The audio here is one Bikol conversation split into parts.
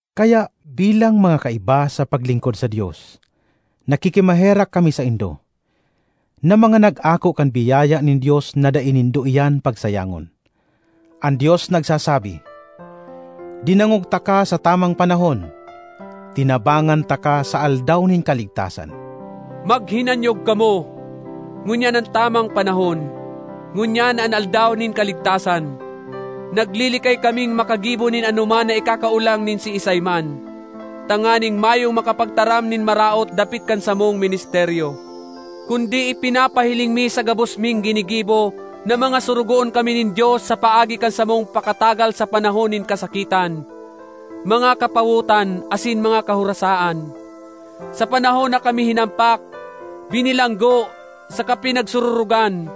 Kaya bilang mga kaiba sa paglingkod sa Dios, nakikimaherak kami saindo, na mga nag-ako kan biyaya nin Dios na dai nindo iyan pagsayangon. An Dios nagsasabi: “Dinangog taka sa tamang panahon, tinabangan taka sa aldaw nin kaligtasan.” Maghinanyog kamo! Ngunyan an tamang panahon; ngunyan an aldaw nin kaligtasan! Naglilikay kaming makagibo nin anoman na ikakaolang nin siisay man, tanganing mayong makapagtaram nin maraot dapit kan samong ministeryo. Kundi ipinapahiling mi sa gabos ming ginigibo na mga sorogoon kami nin Dios sa paagi kan samong pakatagal sa panahon nin kasakitan, mga kapawotan, asin mga kahorasaan; sa panahon na kami hinampak, binilanggo, saka pinagsururogan;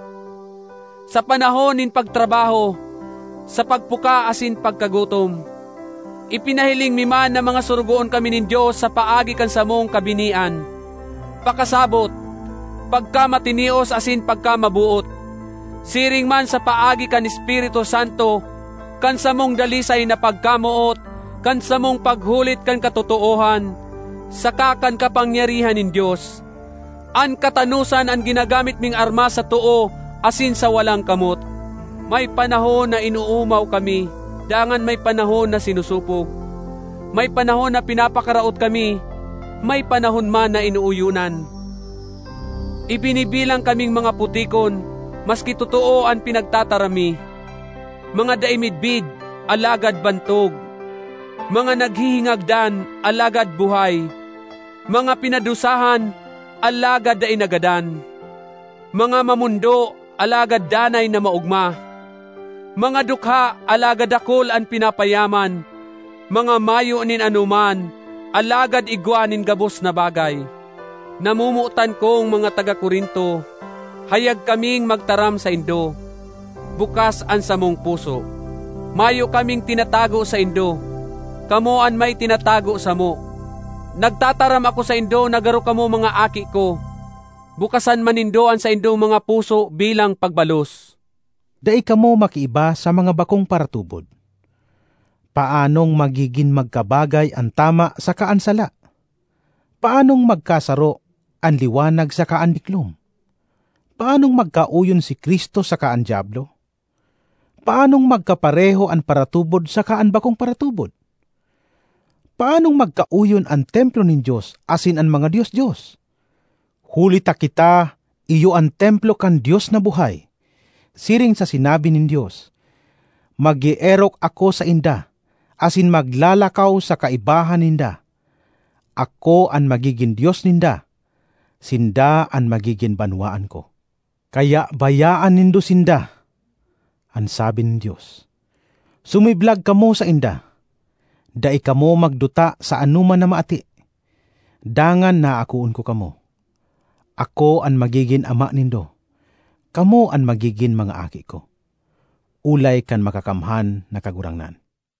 sa panahon nin pagtrabaho, sa pagpuka asin pagkagutom. Ipinahiling mi man na mga sorogoon kami nin Dios sa paagi kan samong kabinian, pakasabot, pagkamatinios asin pagkamaboot; siring man sa paagi kan Espiritu Santo, kan samong dalisay na pagkamoot, kan samong paghulit kan katotoohan, saka kan kapangyarihan nin Dios. An katanosan an ginagamit ming armas sa too asin sa walang kamot. May panahon na inoomaw kami dangan may panahon na sinosopog; may panahon na pinapakaraot kami, may panahon man na inooyonan. Ibinibilang kaming mga putikon, maski totoo an pinagtataram mi; mga dai midbid, alagad bantog; mga naghihingagdan, alagad buhay; mga pinadusahan, alagad dai nagadan; mga mamondo, alagad danay na maogma; mga dukha, alagad dakul an pinapayaman; mga mayo nin anoman, alagad igwa nin gabos na bagay. Namomotan kong mga taga Corinto, hayag kaming magtaram saindo; bukas an samong puso. Mayo kaming tinatago saindo; kamo an may tinatago samo. Nagtataram ako saindo na garo kamo mga aki ko. Bukasan man nindo an saindong mga puso bilang pagbalos! Dai kamo makiiba sa mga bakong paratubod. Paanong magigin magkabagay an tama saka an sala? Paanong magkasaro an liwanag saka an diklom? Paanong magkaoyon si Cristo saka an Diablo? Paanong magkapareho an paratubod saka an bakong paratubod? Paanong magkaoyon an templo nin Dios asin an mga dios-dios? Huli ta kita iyo an templo kan Dios na buhay! Siring sa sinabi nin Dios, “Mag-eerok ako sainda asin maglalakaw sa kaibahan ninda; ako an magigin Dios ninda, sinda an magigin banwaan ko.” ”Kaya bayaan nindo sinda,” an sabi nin Dios, “sumiblag kamo sainda. Dai kamo magduta sa anoman na maati, dangan aakoon ko kamo. Ako an magigin ama nindo, kamo an magigin mga aki ko, olay kan Makakamhan na Kagurangnan.”